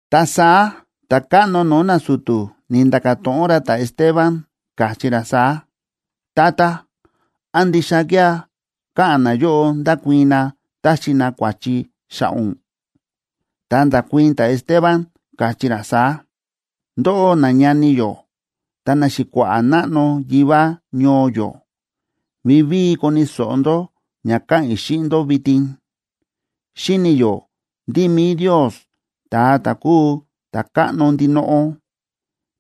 Ta saá ta̱káꞌno no̱o̱ nasu̱tu̱ ni̱nda̱ka̱ to̱ꞌon ra ta̱Esteban, káchí ra saá: ―Tata, ¿án ndixa kía̱ káꞌa̱n nayóꞌo ndákuii̱n na táxi na kua̱chi xa̱ꞌa̱ ún? Ta nda̱kuii̱n ta̱Esteban, káchí ra saá: ―Ndóꞌó, nañani yó ta naxi̱kua̱ꞌa̱ náꞌno yivá ñoo yó, vivíi koni̱ so̱ꞌo ndó ña ka̱ꞌa̱n i̱ xíꞌin ndó vitin. Xíni̱ yó ndí mi̱i Ndios, ta̱a ta̱ kúu Ta̱káꞌno ndinoꞌo,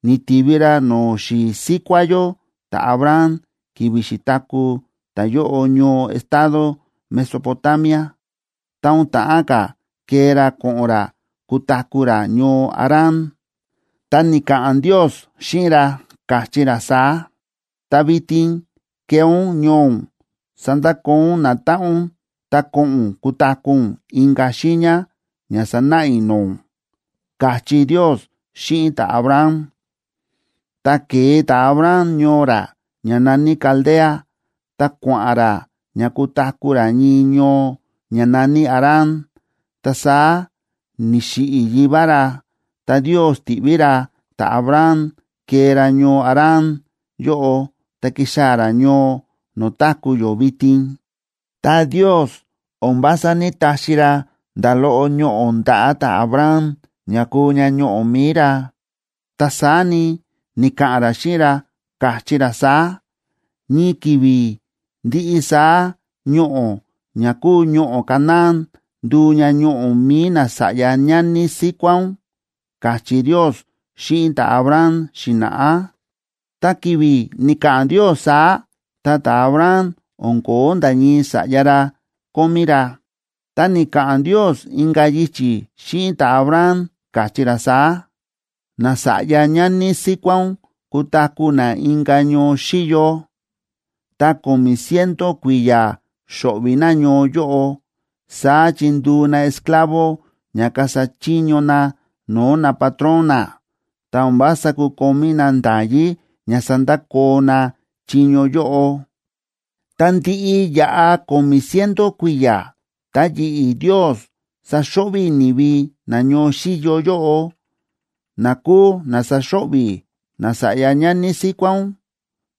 ni̱tivi ra no̱o̱ xi̱i̱ síkuá yó ta̱Abraham ki̱vi̱ xi̱taku̱ ta̱yóꞌo ñoo estado Mesopotamia, ta o̱n ta̱ꞌán ka̱ kee ra ko̱ꞌo̱n ra kutaku̱ ra ñoo Harán, ta ni̱ka̱ꞌa̱n Ndios xíꞌin ra, káchí ra saá: “Ta vitin kee ún ñoo ún, sandakoo ún natáꞌan ún, ta ko̱ꞌo̱n ún kutaku̱ ún inka̱ xiiña ña sanáꞌa i̱ no̱o̱ ún”, káchí Ndios xíꞌin ta̱Abraham. Ta ke̱e ta̱Abraham ñoo ra ña na̱ní Caldea ta kua̱ꞌa̱n ra ña kutaku̱ ra ñii ñoo ña na̱ní Harán. Ta saá ni̱xiꞌi̱ yivá ra, ta Ndios ti̱ꞌví ra ta̱Abraham kee ra ñoo Harán yóꞌo ta ki̱xaa̱ ra ñoo no̱o̱ táku̱ yó vitin. Ta Ndios o̱n vása ní‑taxi ra nda̱ loꞌo ñoꞌo̱ ndaꞌa̱ ta̱Abraham ña kuu ña ñoꞌo̱ mi̱i ra, ta saá ni, ni̱ka̱ꞌa̱n ra xíꞌin ra, káchí ra saá: “Ñii ki̱vi̱ ndiꞌi saá ñoꞌo̱ ña kúu ñoꞌo̱ Canaán nduu ña ñoꞌo̱ mi̱i nasa̱ꞌya ñani síkuá ún”, káchí Ndios xíꞌin ta̱Abraham xi̱na̱ꞌá. Ta ki̱vi̱ ni̱ka̱ꞌa̱n Ndios saá, ta ta̱Abraham o̱n ko̱ó nda̱ ñii sa̱ꞌya ra kómí ra. Ta ni̱ka̱ꞌa̱n Ndios inka̱ yichi̱ xíꞌin ta̱Abraham, káchí ra saá: “Nasa̱ꞌya ñani síkuá ún kutaku̱ na inka̱ ñoo xíyo, ta ko̱mi̱ ciento kui̱ya̱ xo̱ꞌvi̱ na ñoo yóꞌo. Saá chi nduu na esclavo ña kasa chiño na no̱o̱ napatrón na, ta o̱n vása kukomí na nda̱yí ña sandakoo na chiño yóꞌo. Tá ndiꞌi yaꞌa ko̱mi̱ ciento kui̱ya̱, ta yi̱ꞌi̱ Ndios saxo̱ꞌvi̱ i̱ ni̱vi na ñoo xíyo yóꞌo, na kúu na saxo̱ꞌvi̱ nasa̱ꞌya ñani síkuá ún.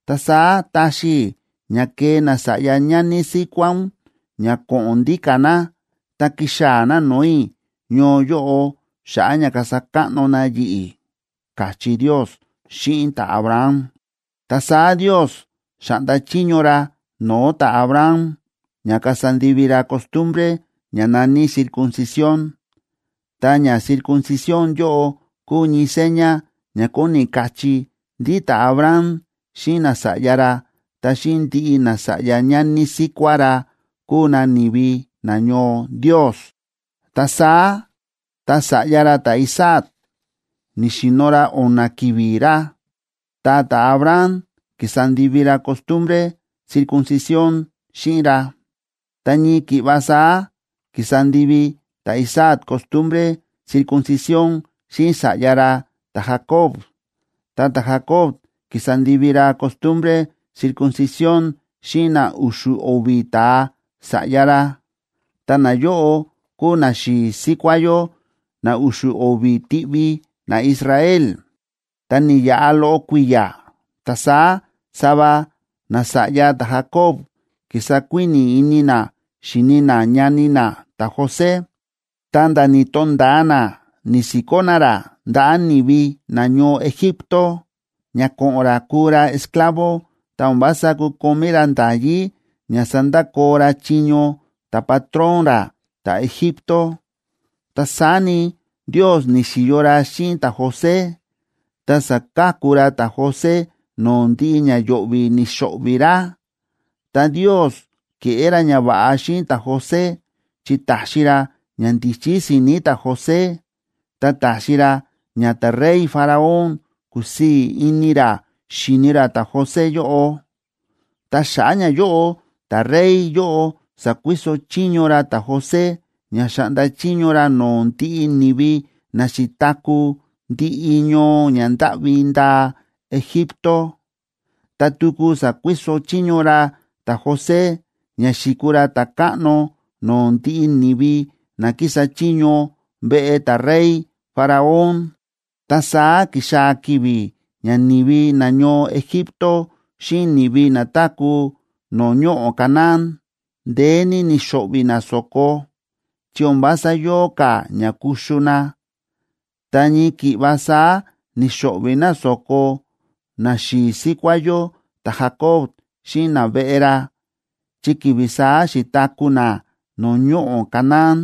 Ta saá taxi i̱ ña kee nasa̱ꞌya ñani síkuá ún ña ko̱ꞌo̱n ndíka̱ na, ta kixaa̱ na no̱o̱ i̱ ñoo yóꞌo xa̱ꞌa̱ ña kasa káꞌno na yi̱ꞌi̱”, káchí Ndios xíꞌin ta̱Abraham. Ta saá Ndios xa̱ꞌnda chiño ra no̱o̱ ta̱Abraham ña kasa ndivi ra costumbre ña na̱ní circuncisión.a Ta ña circuncisión yóꞌo kúu ñii seña ña kóni kachí ndí ta̱Abraham xíꞌin nasa̱ꞌya ra ta xíꞌin ndiꞌi nasa̱ꞌya ñani síkuá ra kuu na ni̱vi nañoo Ndios. Ta saá tá sa̱ꞌya ra ta̱Isaac ni̱xi̱no̱ ra o̱na̱ ki̱vi̱ ra, ta ta̱Abraham ki̱sa ndivi ra costumbre circuncisión xíꞌin ra. Ta ñii ki̱ꞌva saá ki̱sa ndivi ta̱Isaac costumbre circuncisión xíꞌin sa̱ꞌya ra ta̱Jacob, ta ta̱Jacob ki̱sa ndivi ra costumbre circuncisión xíꞌin na u̱xu̱ o̱vi̱ ta̱a sa̱ꞌya ra, ta nayóꞌo kúu naxi̱i̱ síkuá yó na u̱xu̱ o̱vi̱ tiꞌvi naIsrael. ’Ta ni̱yaꞌa loꞌo kui̱ya̱, ta saá sava nasa̱ꞌya ta̱Jacob ki̱sa kuíni̱ ini na xíni na ñani na ta̱José, ta̱nda̱ ni̱to̱nda̱a na ni̱si̱kó na ra ndaꞌa̱ ni̱vi nañoo Egipto ña ko̱ꞌo̱n ra kuu ra esclavo ta o̱n vása kukomí ra nda̱yí ña sandakoo ra chiño ta̱patrón ra ta̱Egipto. Ta saá ni, Ndios ni̱xi̱yo ra xíꞌin ta̱José, ta sa̱ka̱ku ra ta̱José no̱o̱ ndiꞌi ña yo̱ꞌvi̱ ni̱xo̱ꞌvi̱ ra. Ta Ndios ke̱ꞌé ra ñava̱ꞌa xíꞌin ta̱José, chi ta̱xi ra ñandíchí si̱ni̱ ta̱José, ta ta̱xi ra ña ta̱rey Faraón kúsii̱ ini ra xíni ra ta̱José yóꞌo. Ta xa̱ꞌa̱ ñayóꞌo ta̱rey yóꞌo sa̱kuiso chiño ra ta̱José ña xa̱ꞌnda chiño ra no̱o̱ ndiꞌi ni̱vi na xi̱taku̱ ndiꞌi ñoo ña ndáꞌvi ndaa Egipto, ta tuku sa̱kuiso chiño ra ta̱José ña xi̱kuu ra ta̱káꞌno no̱o̱ ndiꞌi ni̱vi na kísa chiño veꞌe ta̱rey Faraón. ’Ta saá ki̱xaa̱ ki̱vi̱ ña ni̱vi nañoo Egipto xíꞌin ni̱vi na táku̱ no̱o̱ ñoꞌo̱ Canaán, ndeé ní ni̱xo̱ꞌvi̱ na so̱ko, chi o̱n vása yóo ka̱ ña kuxu na. Ta ñii ki̱ꞌva saá ni̱xo̱ꞌvi̱ na so̱ko naxi̱i̱ síkuá yó ta̱Jacob xíꞌin naveꞌe ra chi ki̱vi̱ saá xi̱taku̱ na no̱o̱ ñoꞌo̱ Canaán.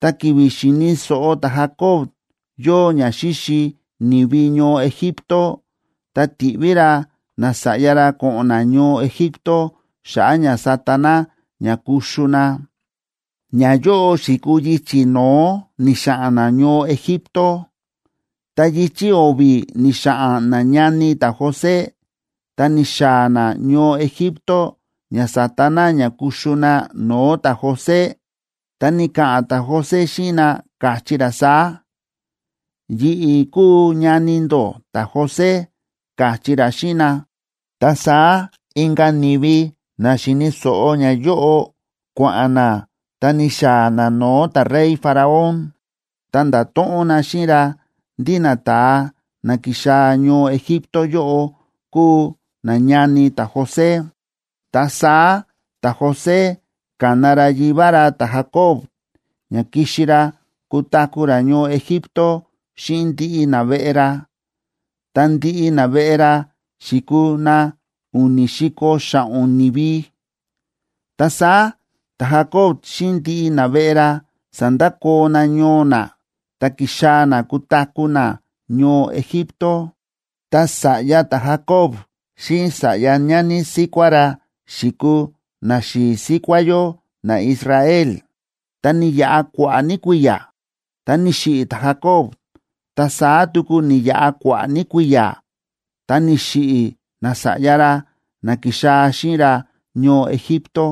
Ta ki̱vi̱ xi̱ni̱ so̱ꞌo ta̱Jacob yóo ña xíxi ni̱vi ñoo Egipto, ta ti̱ꞌví ra nasa̱ꞌya ra ko̱ꞌo̱n na ñoo Egipto xa̱ꞌa̱ ña sata na ña kuxu na. Ñayóꞌo xi̱kuu yichi̱ no̱ó ni̱xa̱ꞌa̱n na ñoo Egipto. Ta yichi̱ o̱vi̱ ni̱xa̱ꞌa̱n nañani ta̱José, ta ni̱xaa̱ na ñoo Egipto ña sata na ña kuxu na no̱o̱ ta̱José, ta ni̱ka̱ꞌa̱n ta̱José xíꞌin na, káchí ra saá: “Yi̱ꞌi̱ kúu ñani ndó ta̱José”, káchí ra xíꞌin na. Ta saá inka̱ ni̱vi na xi̱ni̱ so̱ꞌo ñayóꞌo kua̱ꞌa̱n na ta ni̱xaa̱ na no̱o̱ ta̱rey Faraón, ta nda̱to̱ꞌon na xíꞌin ra ndí nata̱a na ki̱xaa̱ ñoo Egipto yóꞌo kúu nañani ta̱José. Ta saá ta̱José ka̱na ra yivá ra ta̱Jacob, ña kixi ra kutaku̱ ra ñoo Egipto xíꞌin ndiꞌi naveꞌe ra. Ta ndiꞌi naveꞌe ra xi̱kuu na u̱ni̱ si̱ko̱ xa̱ꞌo̱n ni̱vi. Ta saá ta̱Jacob xíꞌin ndiꞌi naveꞌe ra sa̱ndakoo na ñoo na, ta ki̱xaa̱ na kutaku̱ na ñoo Egipto. Ta sa̱ꞌya ta̱Jacob xíꞌin sa̱ꞌya ñani síkuá ra xi̱kuu naxi̱i̱ síkuá yó naIsrael. Ta ni̱yaꞌa kua̱ꞌa̱ ní kui̱ya̱, ta ni̱xiꞌi̱ ta̱Jacob, ta saá tuku ni̱yaꞌa kua̱ꞌa̱ ní kui̱ya̱, ta ni̱xiꞌi̱ nasa̱ꞌya ra na ki̱xaa̱ xíꞌin ra ñoo Egipto.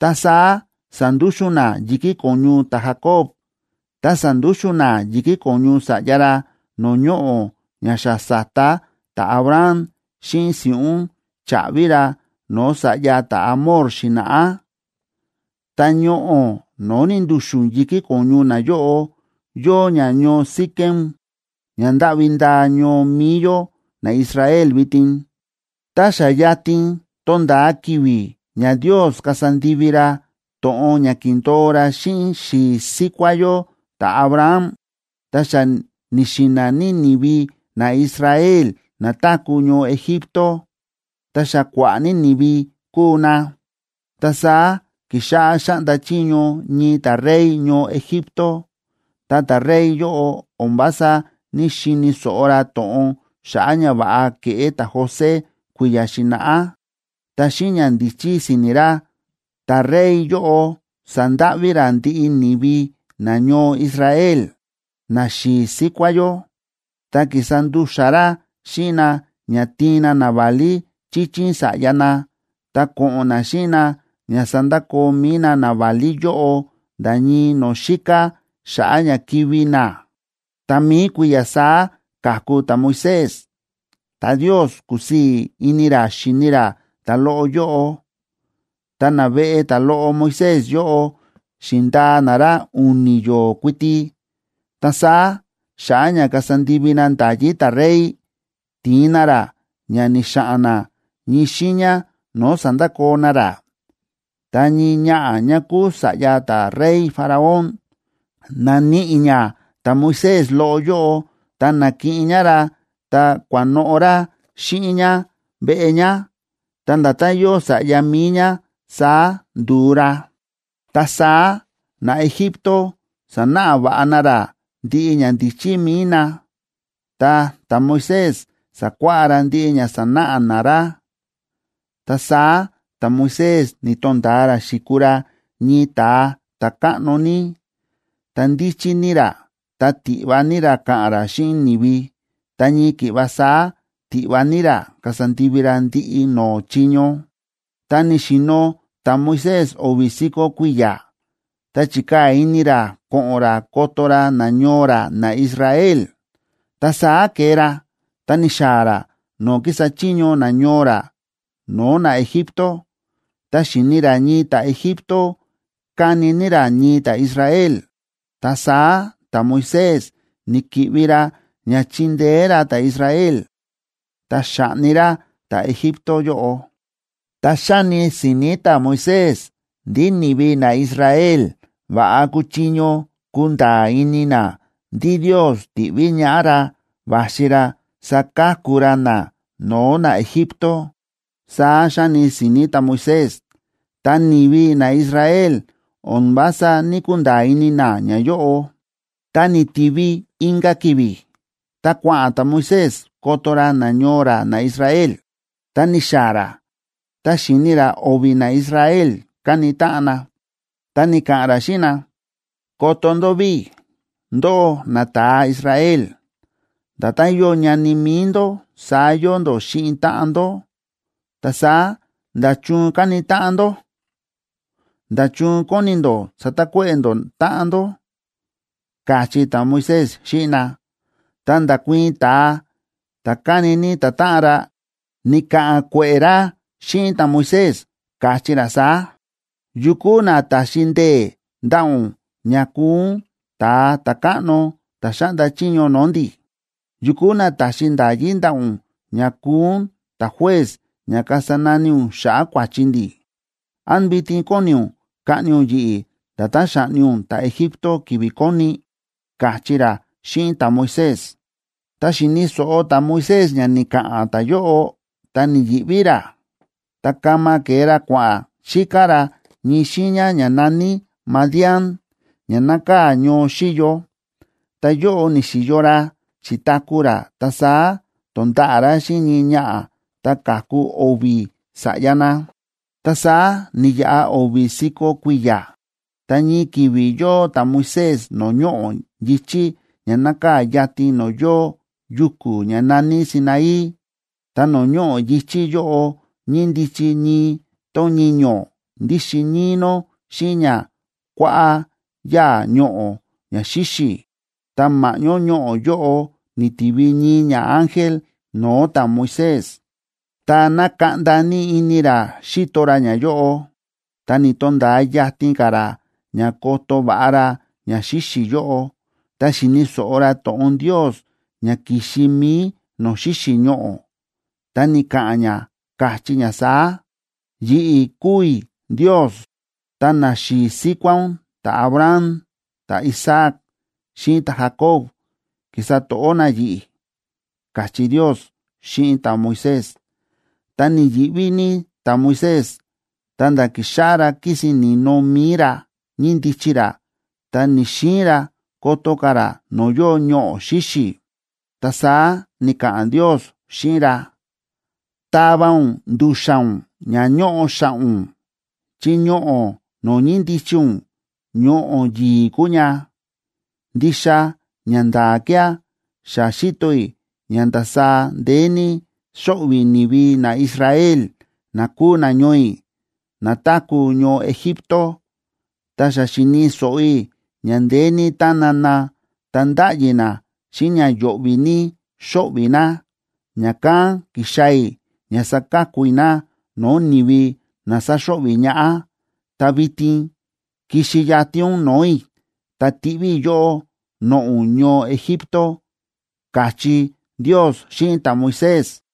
Ta saá sa̱ndúxu̱n na yi̱kí ko̱ñu ta̱Jacob, ta sa̱ndúxu̱n na yi̱kí ko̱ñu sa̱ꞌya ra no̱o̱ ñoꞌo̱ ña xa sa̱ta ta̱Abraham xíꞌin si̱ꞌún cha̱ꞌvi ra no̱o̱ sa̱ꞌya ta̱Hamor xi̱na̱ꞌá. Ta ñoꞌo̱ no̱o̱ ni̱ndu̱xu̱n yi̱kí ko̱ñu nayóꞌo yóo ña ñoo Siquem ña ndáꞌvi ndaa ñoo mi̱i yó naIsrael vitin. ’Tá xa yatin tónda̱a ki̱vi̱ ña Ndios kasa ndivi ra to̱ꞌon ña ki̱ndo̱o ra xíꞌin xi̱i̱ síkuá yó ta̱Abraham, ta xa ni̱xi̱na̱ ní ni̱vi naIsrael na táku̱ ñoo Egipto, ta xa kua̱ꞌa̱ ní ni̱vi kúu na. Ta saá ki̱xáꞌá xáꞌnda chiño ñii ta̱rey ñoo Egipto, ta ta̱rey yóꞌo o̱n vása ní‑xini̱ so̱ꞌo ra to̱ꞌon xa̱ꞌa̱ ñava̱ꞌa ke̱ꞌé ta̱José kui̱ya̱ xi̱na̱ꞌá. Ta xíꞌin ñandíchí si̱ni̱ ra, ta̱rey yóꞌo sa̱ndáꞌví ra ndiꞌi ni̱vi nañoo Israel, naxi̱i̱ síkuá yó, ta ki̱sa ndu̱xa̱ ra xíꞌin na ña tiin na naválí chíchín sa̱ꞌya na, ta ko̱ꞌo̱n na xíꞌin na ña sandakoo mi̱i na naválí yóꞌo nda̱ ñii no̱o̱ xíká xa̱ꞌa̱ ña kivi̱ na. Ta mi̱i kui̱ya̱ saá ka̱ku ta̱Moisés, ta Ndios kúsii̱ ini ra xíni ra ta̱loꞌo yóꞌo. Ta naveꞌe ta̱loꞌo Moisés yóꞌo xi̱ndaa na ra u̱ni̱ yo̱o̱ kuiti, ta saá xa̱ꞌa̱ ña kasa ndivi na nda̱yí ta̱rey, ti̱in na ra ña ni̱xa̱ꞌa̱n na ñii xiiña no̱o̱ sa̱ndakoo na ra. Ta ñii ñaꞌa̱ ñá kúu sa̱ꞌya ta̱rey Faraón, na̱níꞌi ñá ta̱Moisés loꞌo yóꞌo, ta na̱kiꞌin ñá ra, ta kua̱noꞌo̱ ra xíꞌin ñá veꞌe ñá, ta nda̱tán yóo sa̱ꞌya mi̱i ñá saá ndu̱u ra. Ta saá naEgipto sa̱náꞌa va̱ꞌa na ra ndiꞌi ñandíchí mi̱i na, ta ta̱Moisés sa̱kuáꞌá ra ndiꞌi ña sa̱náꞌa na ra. Ta saá ta̱Moisés ni̱to̱nda̱a ra xi̱kuu ra ñii ta̱a ta̱káꞌno ní, ta ndíchí ní ra ta tiꞌva ní ra ka̱ꞌa̱n ra xíꞌin ni̱vi, ta ñii ki̱ꞌva saá tiꞌva ní ra kasa ndivi ra ndiꞌi no̱o̱ chiño. ’Tá ni̱xi̱no̱ ta̱Moisés o̱vi̱ si̱ko̱ kui̱ya̱, ta chi̱kaa̱ ini ra ko̱ꞌo̱n ra koto ra nañoo ra naIsrael. Ta saá ke̱e ra ta ni̱xaa̱ ra no̱o̱ kísa chiño nañoo ra no̱o̱ naEgipto. Ta xi̱ni ra ñii ta̱Egipto káni ní ra ñii ta̱Israel. Ta saá ta̱Moisés ni̱ki̱ꞌvi ra ña chi̱ndeé ra ta̱Israel, ta xa̱ꞌni ra ta̱Egipto yóꞌo. Ta xa̱ni si̱ni̱ ta̱Moisés ndí ni̱vi naIsrael va̱ꞌa kuchiño kunda̱a̱ ini na ndí Ndios ti̱ꞌví ñaꞌá ra va̱xi ra saka̱ku ra na no̱o̱ naEgipto. Saá xa̱ni si̱ni̱ ta̱Moisés, ta ni̱vi naIsrael o̱n vása ní‑kunda̱a̱ ini na ñayóꞌo. Tá ni̱tivi inka̱ ki̱vi̱, ta kua̱ꞌa̱n ta̱Moisés, koto ra nañoo ra naIsrael, ta ni̱xaa̱ ra, ta xi̱ni ra o̱vi̱ naIsrael káni táꞌan na, ta ni̱ka̱ꞌa̱n ra xíꞌin na: “Koto ndó ví. Ndóꞌó, nata̱a Israel, nda̱tán yóo ñani mi̱i ndó saá yóo ndó xíꞌin táꞌan ndó. Ta saá, ¿nda̱chun káni táꞌan ndó? ¿Nda̱chun kóni ndó satakuéꞌe̱ ndó táꞌan ndó?”, káchí ta̱Moisés xíꞌin na. Ta nda̱kuii̱n ta̱a ta̱ ka̱ni ní ta̱táꞌan ra, ni̱ka̱ꞌa̱n kue̱ꞌe̱ ra xíꞌin ta̱Moisés, káchí ra saá: “¿Yu kúu na ta̱xi ndee̱ ndaꞌa̱ ún ña kuu ún ta̱a ta̱káꞌno ta̱ xáꞌnda chiño no̱o̱ ndi̱? ¿Yu kúu na ta̱xi nda̱yí ndaꞌa̱ ún ña kuu ún ta̱juez ña kasa nani ún xa̱ꞌa̱ kua̱chi ndi̱? ¿Án vitin kóni ún kaꞌni ún yi̱ꞌi̱ nda̱tán xa̱ꞌni ún ta̱Egipto ki̱vi̱ koni?”, káchí ra xíꞌin ta̱Moisés. Tá xi̱ni̱ so̱ꞌo ta̱Moisés ña ni̱ka̱ꞌa̱n ta̱yóꞌo, ta ni̱yi̱ꞌví ra, ta kama ke̱e ra kua̱ꞌa̱n xíká ra ñii xiiña ña na̱ní Madián, ña nákaa̱ ñoo xíyo. Ta yóꞌo ni̱xi̱yo ra, xi̱taku̱ ra, ta saá to̱nda̱ꞌa̱ ra xíꞌin ñii ñaꞌa̱, ta ka̱ku o̱vi̱ sa̱ꞌya na. ’Ta saá ni̱yaꞌa o̱vi̱ si̱ko̱ kui̱ya̱, ta ñii ki̱vi̱ yóo ta̱Moisés no̱o̱ ñoꞌo̱ yi̱chí ña nákaa̱ yatin no̱o̱ yóo yuku̱ ña na̱ní Sinaí. Ta no̱o̱ ñoꞌo̱ yi̱chí yóꞌo ñíndichi ñii tón ñiño̱ ndíxin níí nó xíꞌin ña kua̱ꞌa̱ yáa̱ ñoꞌo̱ ña xíxi̱, ta ma̱ꞌñó ñoꞌo̱ yóꞌo ni̱tivi ñii ñaángel no̱o̱ ta̱Moisés. Ta na̱kaꞌnda ní ini ra xi̱to ra ñayóꞌo. Ta ni̱to̱nda̱a yatin ka̱ ra ña koto va̱ꞌa ra ña xíxi̱ yóꞌo, ta xi̱ni̱ so̱ꞌo ra to̱ꞌon Ndios ña ki̱xi mi̱i no̱o̱ xíxi̱ ñoꞌo̱. Ta ni̱ka̱ꞌa̱n ña, káchí ña saá: “Yi̱ꞌi̱ kúu i̱ Ndios, ta naxi̱i̱ síkuá ún ta̱Abraham, ta̱Isaac xíꞌin ta̱Jacob ki̱sa to̱ꞌó na yi̱ꞌi̱”, káchí Ndios xíꞌin ta̱Moisés. Ta ni̱yi̱ꞌví ní ta̱Moisés, ta̱nda̱ ki̱xáꞌá ra kísin ni̱no mi̱i ra, ñíndichi ra, ta ni̱‑xiin ra koto ka̱ ra no̱o̱ yóo ñoꞌo̱ xíxi̱. Ta saá ni̱ka̱ꞌa̱n Ndios xíꞌin ra: “Tava ún ndu̱xa̱n ún ña ñóꞌo xa̱ꞌa̱ ún, chi ñoꞌo̱ no̱o̱ ñíndichi ún ñoꞌo̱ yi̱i̱ kúu ña. Ndixa ñanda̱a̱ kía̱ xa xíto i̱ ña ndasaá ndeé ní xóꞌvi̱ ni̱vi naIsrael, na kúu nañoo i̱, na táku̱ ñoo Egipto, ta xa xíni̱ so̱ꞌo i̱ ña ndeé ní tána na ta ndáꞌyi na xíꞌin ña yo̱ꞌvi̱ ní xóꞌvi̱ na, ña̱kán ki̱xaa̱ i̱ ña saka̱ku i̱ na no̱o̱ ni̱vi na sáxo̱ꞌvi̱ ñaꞌá. Ta vitin kixi yatin ún no̱o̱ i̱, ta tiꞌví i̱ yóꞌó noꞌo̱ ún ñoo Egipto”, káchí Ndios xíꞌin ta̱Moisés.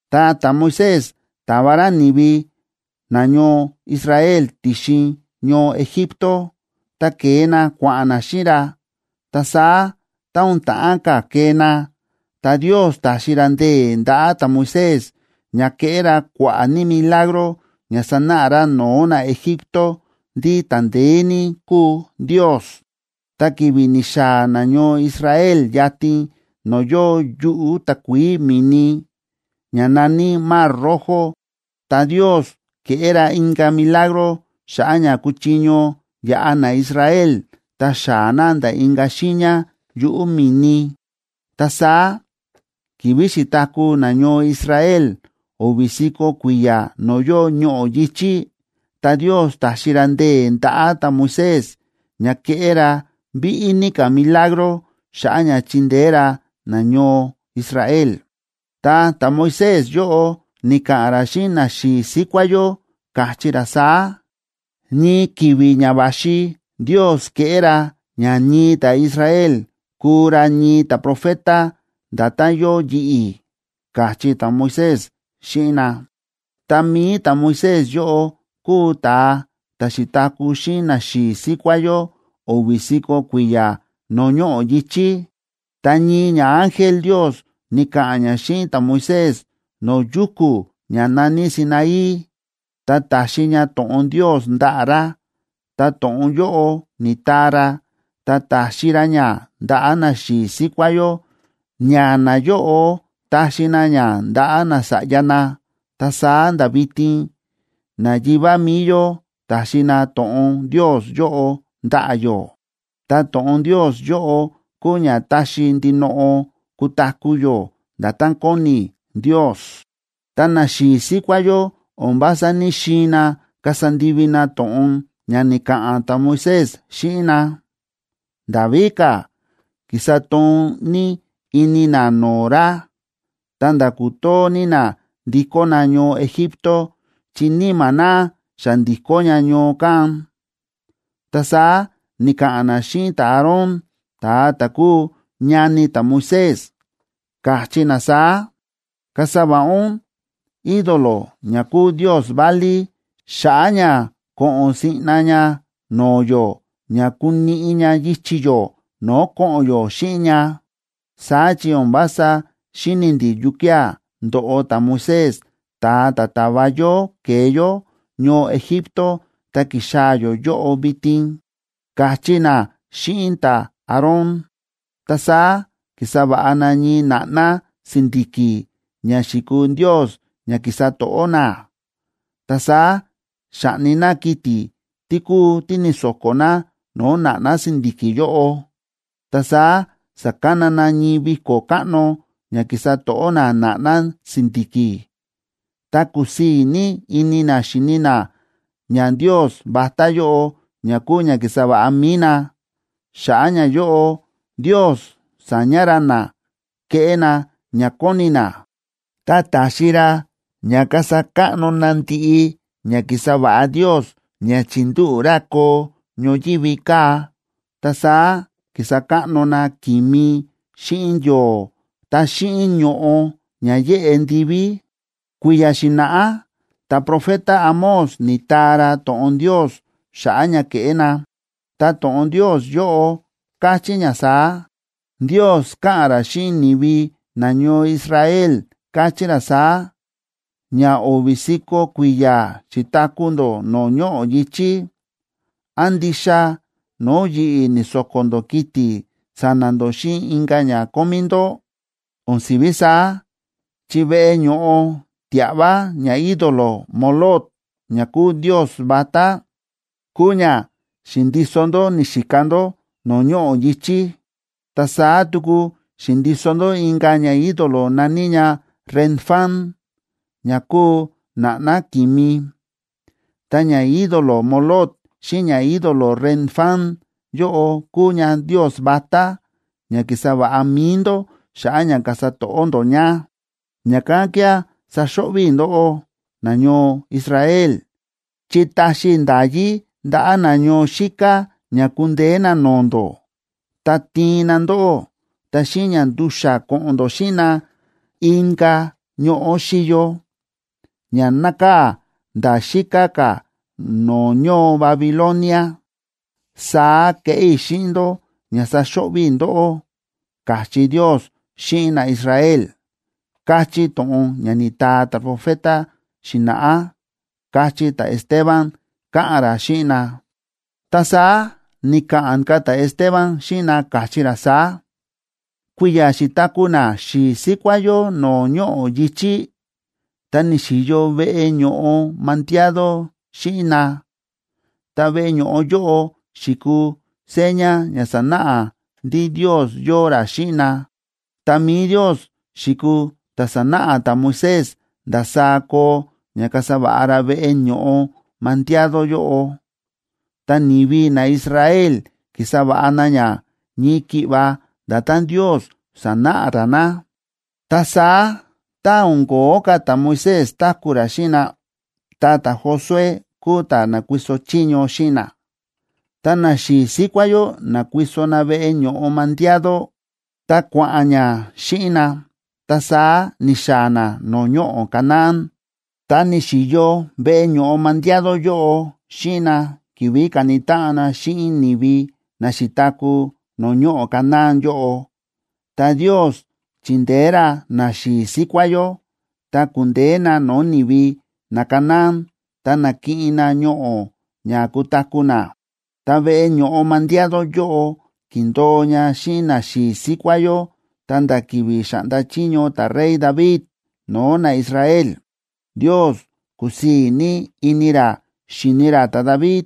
Ta ta̱Moisés ta̱va ra ni̱vi nañoo Israel ti̱xin ñoo Egipto, ta ke̱e na kua̱ꞌa̱n na xíꞌin ra. Ta saá tá o̱n ta̱ꞌán ka̱ kee na, ta Ndios ta̱xi ra ndee̱ ndaꞌa̱ ta̱Moisés ña ke̱ꞌé ra kua̱ꞌa̱ ní milagro ña sa̱náꞌa ra no̱o̱ naEgipto ndí ta̱ ndeé ní kúu Ndios. Ta ki̱vi̱ ni̱xaa̱ nañoo Israel yatin no̱o̱ yóo yuꞌu̱ takuií mi̱ni, ña na̱ní Mar Rojo, ta Ndios ke̱ꞌé ra inka̱ milagro xa̱ꞌa̱ ña kuchiño yaꞌa naIsrael, ta xaa̱ na nda̱ inka̱ xiiña yuꞌu̱ mi̱ni. Ta saá ki̱vi̱ xi̱taku̱ nañoo Israel o̱vi̱ si̱ko̱ kui̱ya̱ no̱o̱ yóo ñoꞌo̱ yi̱chí, ta Ndios ta̱xi ra ndee̱ ndaꞌa̱ ta̱Moisés ña ke̱ꞌé ra víꞌí ní ka̱ milagro xa̱ꞌa̱ ña chindeé ra nañoo Israel. Ta ta̱Moisés yóꞌo ni̱ka̱ꞌa̱n ra xíꞌin naxi̱i̱ síkuá yó, káchí ra saá: “Ñii ki̱vi̱ ña va̱xi Ndios keꞌé ra ña ñii ta̱Israel, kuu ra ñii ta̱profeta, nda̱tán yóo yi̱ꞌi̱”, káchí ta̱Moisés xíꞌin na. Ta mi̱i ta̱Moisés yóꞌo kúu ta̱a ta̱ xi̱taku̱ xíꞌin naxi̱i̱ síkuá yó o̱vi̱ si̱ko̱ kui̱ya̱ no̱o̱ ñoꞌo̱ yi̱chí. Ta ñii ñaángel Ndios ni̱ka̱ꞌa̱n ña xíꞌin ta̱Moisés no̱o̱ yuku̱ ña na̱ní Sinaí, ta ta̱xi ña to̱ꞌon Ndios ndaꞌa̱ ra, ta to̱ꞌon yóꞌo ni̱taa ra, ta ta̱xi ra ña ndaꞌa̱ naxi̱i̱ síkuá yó, ña nayóꞌo ta̱xi na ña ndaꞌa̱ nasa̱ꞌya na, ta saá nda̱ vitin nayivá mi̱i yó ta̱xi na to̱ꞌon Ndios yóꞌo ndaꞌa̱ yó. Ta to̱ꞌon Ndios yóꞌo kúu ña taxi ndinoꞌo kutaku̱ yó nda̱tán kóni Ndios. ’Ta naxi̱i̱ síkuá yó o̱n vása ní‑xiin na kasa ndivi na to̱ꞌon ña ni̱ka̱ꞌa̱n ta̱Moisés xíꞌin na, nda̱ víka̱ ki̱sa toon ní ini na no̱o̱ ra, ta̱nda̱ ku̱too ní na ndikó na ñoo Egipto, chi níma̱ na xa ndi̱kó ña ñoo kán. Ta saá ni̱ka̱ꞌa̱n na xíꞌin ta̱Aarón, ta̱a ta̱ kúu ñani ta̱Moisés, káchí na saá: “Kasa va̱ꞌa ún ídolo ña kuu ndios válí xa̱ꞌa̱ ña ko̱ꞌo̱n siꞌna ña no̱o̱ yó ña kuniꞌi ña yichi̱ yó no̱o̱ ko̱ꞌo̱n yó xíꞌin ña, saá chi o̱n vása xíni̱ ndi̱ yukía̱ ndo̱ꞌo ta̱Moisés ta̱a ta̱ ta̱va yó ke̱e yó ñoo Egipto ta ki̱xaa̱ yó yóꞌo vitin”, káchí na xíꞌin ta̱Aarón. Ta saá ki̱sa va̱ꞌa na ñii na̱ꞌná si̱ndi̱ki̱ ña xi̱kuu ndios ña ki̱sa to̱ꞌó na. Ta saá xa̱ꞌni na kiti̱ tí kúu tí ni̱so̱ko̱ na no̱o̱ na̱ꞌná si̱ndi̱ki̱ yóꞌo. Ta saá sa̱kana na ñii viko̱ káꞌno ña ki̱sa to̱ꞌó na na̱ꞌná si̱ndi̱ki̱, ta kúsii̱ ní ini na xíni na ñandios vatá yóꞌo ña kúu ña ki̱sa va̱ꞌa mi̱i na. Xa̱ꞌa̱ ñayóꞌo Ndios sa̱ña ra na keꞌé na ña kóni na, ta ta̱xi ra ña kasa káꞌno na ndiꞌi ña ki̱sa va̱ꞌa Ndios ña chi̱ndúꞌu̱ ra koo ñoyívi kaa̱. Ta saá ki̱sa káꞌno na ki̱mi xíꞌin yo̱o̱ ta xíꞌin ño̱ꞌo ña yéꞌe ndiví. Kui̱ya̱ xi̱na̱ꞌá ta̱profeta Amós ni̱taa ra to̱ꞌon Ndios xa̱ꞌa̱ ña ke̱ꞌé na, ta to̱ꞌon Ndios yóꞌo káchí ña saá: Ndios káꞌa̱n ra xíꞌin ni̱vi nañoo Israel, káchí ra saá: “Ña o̱vi̱ si̱ko̱ kui̱ya̱ xi̱taku̱ ndó no̱o̱ ñoꞌo̱ yi̱chí, ¿án ndixa no̱o̱ yi̱ꞌi̱ ni̱so̱ko̱ ndó kiti̱ sa̱na̱ ndó xíꞌin inka̱ ña kómí ndó? O̱n si̱ví saá, chi veꞌe ño̱ꞌo tia̱ꞌva ñaídolo Moloc, ña kúu ndios vatá, kúu ña xi̱ndiso ndó ni̱xika ndó no̱o̱ ñoꞌo̱ yi̱chí. Ta saá tuku xi̱ndiso ndó inka̱ ñaídolo na̱ní ña Renfán, ña kúu na̱ꞌná ki̱mi. Ta ñaídolo Moloc xíꞌin ñaídolo Renfán yóꞌo kúu ñandios vatá ña ki̱sa va̱ꞌa mi̱i ndó xa̱ꞌa̱ ña kasa to̱ꞌó ndó ña. Ña̱kán kía̱ saxo̱ꞌvi̱ i̱ ndóꞌó, nañoo Israel, chi taxi i̱ nda̱yí ndaꞌa̱ na ñoo xíká ña kundeé na no̱o̱ ndó, ta tiin na ndóꞌó, ta xíꞌin ña ndu̱xa̱ ko̱ꞌo̱n ndó xíꞌin na inka̱ ñoꞌo̱ xíyo, ña nákaa̱ nda̱ xíká ka̱ no̱o̱ ñoo Babilonia. Saá keꞌé i̱ xíꞌin ndó ña saxo̱ꞌvi̱ i̱ ndóꞌó”, káchí Ndios xíꞌin naIsrael, káchí to̱ꞌon ña ni̱taa ta̱profeta xi̱na̱ꞌá ―káchí ta̱Esteban káꞌa̱n ra xíꞌin na. Ta saá ni̱ka̱ꞌa̱n ka̱ ta̱Esteban xíꞌin na, káchí ra saá: ―Kui̱ya̱ xi̱taku̱ naxi̱i̱ síkuá yó no̱o̱ ñoꞌo̱ yi̱chí, ta ni̱xi̱yo veꞌe ño̱ꞌo mandiado xíꞌin na. Ta veꞌe ño̱ꞌo yóꞌo xi̱kuu seña ña sánáꞌa ndí Ndios yóo ra xíꞌin na. Ta mi̱i Ndios xi̱kuu ta̱ sa̱náꞌa ta̱Moisés ndasaá koo ña kasa va̱ꞌa ra veꞌe ño̱ꞌo mandiado yóꞌo, ta ni̱vi naIsrael ki̱sa va̱ꞌa na ña ñii ki̱ꞌva nda̱tán Ndios sa̱náꞌa ra na. Ta saá, tá o̱n ko̱ó ka̱ ta̱Moisés táku̱ ra xíꞌin na, ta ta̱Josué kúu ta̱ na̱kuiso chiño xíꞌin na, ta naxi̱i̱ síkuá yó na̱kuiso na veꞌe ño̱ꞌo mandiado, ta kua̱ꞌa̱n ña xíꞌin na, ta saá ni̱xaa̱ na no̱o̱ ñoꞌo̱ Canaán. Ta ni̱xi̱yo veꞌe ño̱ꞌo mandiado yóꞌo xíꞌin na ki̱vi̱ ka̱ni táꞌan na xíꞌin ni̱vi na xi̱taku̱ no̱o̱ ñoꞌo̱ Canaán yóꞌo. Ta Ndios chi̱ndeé ra naxi̱i̱ síkuá yó, ta ku̱ndeé na no̱o̱ ni̱vi naCanaán ta na̱kiꞌin na ñoꞌo̱ na ña kutaku̱ na. Ta veꞌe ño̱ꞌo mandiado yóꞌo ki̱ndo̱o ña xíꞌin naxi̱i̱ síkuá yó ta̱nda̱ ki̱vi̱ xáꞌnda chiño ta̱rey David no̱o̱ naIsrael. Ndios kúsii̱ ní ini ra xíni ra ta̱David,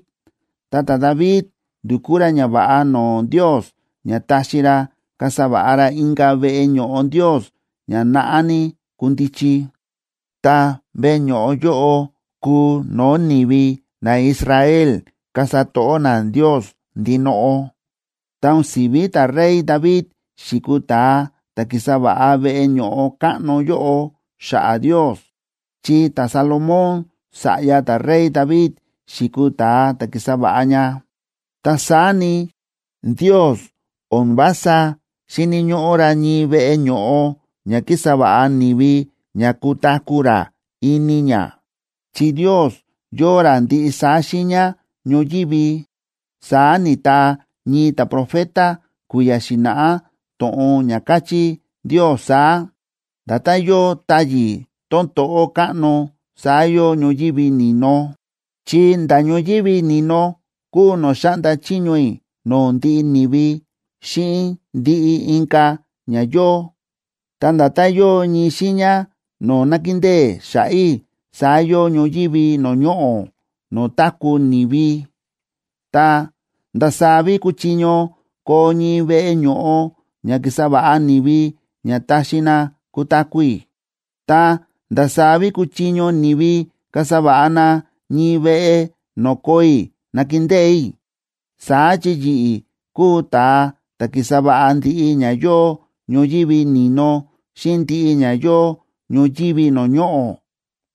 ta ta̱David ndu̱kú ra ñava̱ꞌa no̱o̱ Ndios ña taxi ra kasa va̱ꞌa ra inka̱ veꞌe ño̱ꞌo Ndios ña naꞌá ní kundichi. Ta veꞌe ño̱ꞌo yóꞌo kuu no̱o̱ ni̱vi naIsraelb kasa to̱ꞌó na Ndios ndinoꞌo. Ta o̱n si̱ví ta̱rey David xi̱kuu ta̱a ta̱ ki̱sa va̱ꞌa veꞌe ño̱ꞌo káꞌno yóꞌo xa̱ꞌa̱ Ndios, chi ta̱Salomón sa̱ꞌya ta̱rey David xi̱kuu ta̱a ta̱ ki̱sa va̱ꞌa ña. Ta saá ni, Ndios o̱n vása xíni̱ ñóꞌó ra ñii veꞌe ño̱ꞌo ña kísa va̱ꞌa ni̱vi ña kutaku̱ ra ini ña, chi Ndios yóo ra ndiꞌi saá xiiña ñoyívi. Saá ni̱taa ñii ta̱profeta kui̱ya̱ xi̱na̱ꞌá to̱ꞌon ña káchí Ndios saá: Nda̱tán yóo táyi̱ tón to̱ꞌó káꞌno, saá yóo ñoyívi ni̱no, chi nda̱ ñoyívi ni̱no kúu no̱o̱ xáꞌnda chiño i̱ no̱o̱ ndiꞌi ni̱vi xíꞌin ndiꞌi inka̱ ña yóo. Ta nda̱tán yóo ñii xiiña no̱o̱ nákindée xa̱ꞌa̱ i̱, saá yóo ñoyívi no̱o̱ ñoꞌo̱ no̱o̱ táku̱ ni̱vi. Ta, ¿ndasaá ví kuchiño koo ñii veꞌe ño̱ꞌo ña ki̱sa va̱ꞌa ni̱vi ña taxi na kutaku̱ i̱? Ta, ¿ndasaá ví kuchiño ni̱vi kasa va̱ꞌa na ñii veꞌe no̱o̱ koo i̱ nakindée i̱? Saá chi yi̱ꞌi̱ kúu ta̱a ta̱ ki̱sa va̱ꞌa ndiꞌi ña yóo ñoyívi ni̱no xíꞌin ndiꞌi ña yóo ñoyívi no̱o̱ ñoꞌo̱”,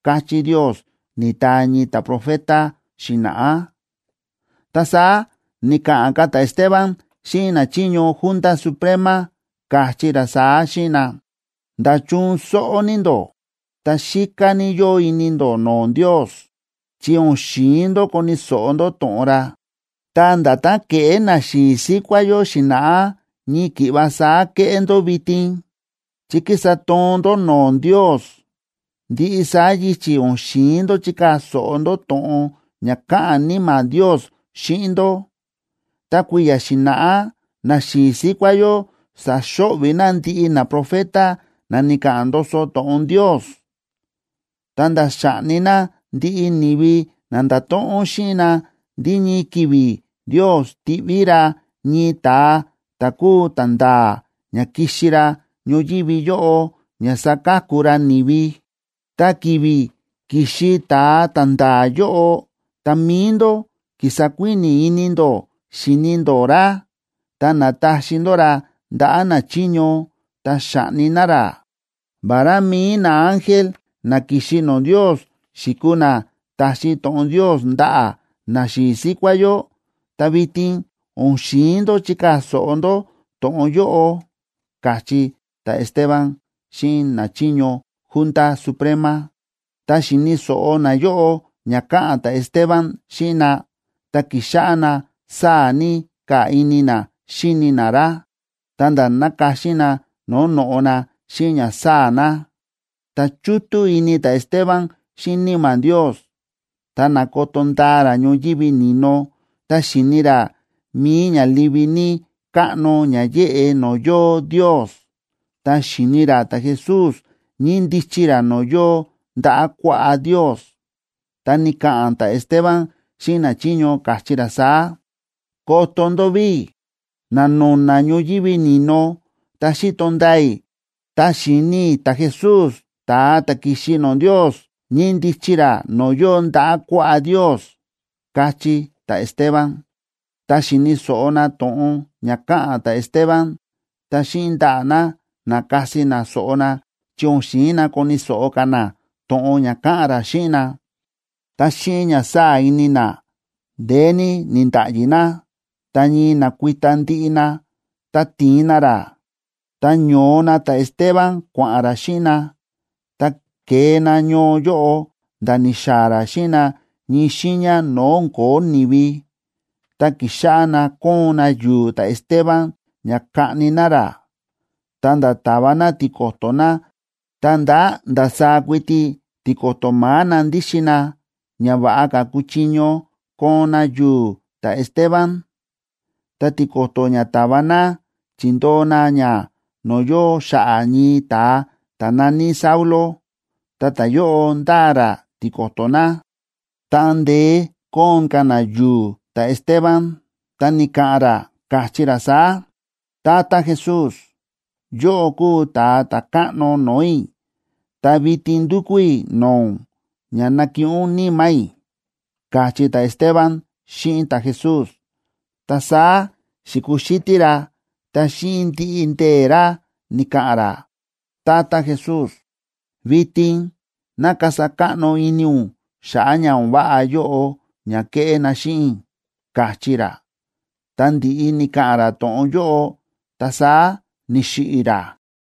káchí Ndios, ni̱taa ñii ta̱profeta xi̱na̱ꞌá. Ta saá ni̱ka̱ꞌa̱n ka̱ ta̱Esteban xíꞌin nachiño Junta Suprema, káchí ra saá xíꞌin na: ―¡Nda̱chun sóꞌó ní ndó!, ta xíká ní yóo ini ndó no̱o̱ Ndios, chi o̱n xi̱in ndó koni̱ so̱ꞌo ndó to̱ꞌon ra. Ta nda̱tán ke̱ꞌé naxi̱i̱ síkuá yó xi̱na̱ꞌá, ñii ki̱ꞌva saá kéꞌé ndó vitin, chi kísa toon ndó no̱o̱ Ndios. Ndiꞌi saá yichi̱ o̱n xi̱in ndó chikaa̱ so̱ꞌo ndó to̱ꞌon ña káꞌa̱n Níma̱ Ndios xíꞌin ndó. Ta kui̱ya̱ xi̱na̱ꞌá naxi̱i̱ síkuá yó sa̱xo̱ꞌvi̱ na ndiꞌi naprofeta na ni̱ka̱ꞌa̱n ndoso to̱ꞌon Ndios, ta̱nda̱ xa̱ꞌni na ndiꞌi ni̱vi na nda̱to̱ꞌon xíꞌin na ndí ñii ki̱vi̱ Ndios tiꞌví ra ñii ta̱a ta̱ kúu ta̱nda̱a̱ ña kixi ra ñoyívi yóꞌo ña saka̱ku ra ni̱vi. Ta ki̱vi̱ ki̱xi ta̱a ta̱nda̱a̱ yóꞌo, ta mi̱i ndó ki̱sa kuíni̱ ini ndó xíni ndó ra ta na̱taxi ndó ra ndaꞌa̱ nachiño, ta xa̱ꞌni na ra. Vará mi̱i naángel na ki̱xi no̱o̱ Ndios xi̱kuu na ta̱xi to̱ꞌon Ndios ndaꞌa̱ naxi̱i̱ síkuá yó, ta vitin o̱n xi̱in ndó chikaa̱ so̱ꞌo ndó to̱ꞌon yóꞌo ―káchí ta̱Esteban xíꞌin nachiño Junta Suprema. Tá xíni̱ so̱ꞌo nayóꞌo ña káꞌa̱n ta̱Esteban xíꞌin na, ta ki̱xáꞌá na sáa̱ ní ka̱ ini na xíni na ra, ta̱nda̱ nákaxi na no̱o̱ no̱ꞌo na xíꞌin ña sáa̱ na. Ta chútú ini ta̱Esteban xíꞌin Níma̱ Ndios, ta na̱koto ndaa ra ñoyívi ni̱no, ta xi̱ni ra mi̱i ña livi ní káꞌno ña yéꞌe no̱o̱ yóo Ndios, ta xi̱ni ra ta̱Jesús ñíndichi ra no̱o̱ yóo ndaꞌa̱ kuaꞌá Ndios, ta ni̱ka̱ꞌa̱n ta̱Esteban xíꞌin nachiño, káchí ra saá: ―¡Koto ndó ví! Na̱no̱na̱ ñoyívi ni̱no, ta xíto ndaa i̱, ta xíni i̱ ta̱Jesús, ta̱a ta̱ ki̱xi no̱o̱ Ndios, ñíndichi ra no̱o̱ yóo ndaꞌa̱ kuaꞌá Ndios ―káchí ta̱Esteban. Tá xíni̱ so̱ꞌo na to̱ꞌon ña káꞌa̱n ta̱Esteban, ta xíꞌin ndaꞌa̱ na na̱kasi na so̱ꞌo na chi o̱n xi̱in na koni̱ so̱ꞌo ka̱ na to̱ꞌon ña káꞌa̱n ra xíꞌin na. Ta xíꞌin ña sáa̱ ini na, ndeé ní ni̱nda̱ꞌyi na, ta ñii na̱kuita ndiꞌi na, ta ti̱in na ra. Ta ño̱o na ta̱Esteban kua̱ꞌa̱n ra xíꞌin na, ta ke̱e na ñoo yóꞌo, nda̱ ni̱xaa̱ ra xíꞌin na ñii xiiña no̱o̱ o̱n ko̱ó ni̱vi, ta ki̱xáꞌá na kóon na yu̱u̱ ta̱Esteban ña kaꞌni na ra. Ta nda̱ ta̱va na tiko̱to̱ na, ta nda̱ ndasaá kuiti tiko̱to̱ ma̱á na ndíxin na, ña va̱ꞌa ka̱ kuchiño koon na yu̱u̱ ta̱Esteban. Ta tiko̱to̱ ña ta̱va na, chi̱ndoo na ña no̱o̱ yóo xa̱ꞌa̱ ñii ta̱a ta̱ na̱ní Saulo, ta ta̱yóꞌo ndáa ra tiko̱to̱ na. Táꞌan ndeé kóon ka̱ na yu̱u̱ ta̱Esteban, ta ni̱ka̱ꞌa̱n ra, káchí ra saá: ―Tata Jesús, yóꞌó kúu Ta̱a Ta̱káꞌno no̱o̱ i̱, ta vitin ndúkú i̱ no̱o̱ ún ña nakiꞌin ún níma̱ i̱ ―káchí ta̱Esteban xíꞌin ta̱Jesús. Ta saá xi̱kuxítí ra ta xíꞌin ndiꞌi ndee̱ ra ni̱ka̱ꞌa̱n ra: ―Tata Jesús, vitin ná kasa káꞌno ini ún xa̱ꞌa̱ ña o̱n váꞌa yóꞌo ña kéꞌé na xíꞌin i̱ ―káchí ra. Tá ndi̱ꞌi ni̱ka̱ꞌa̱n ra to̱ꞌon yóꞌo, ta saá ni̱xiꞌi̱ ra.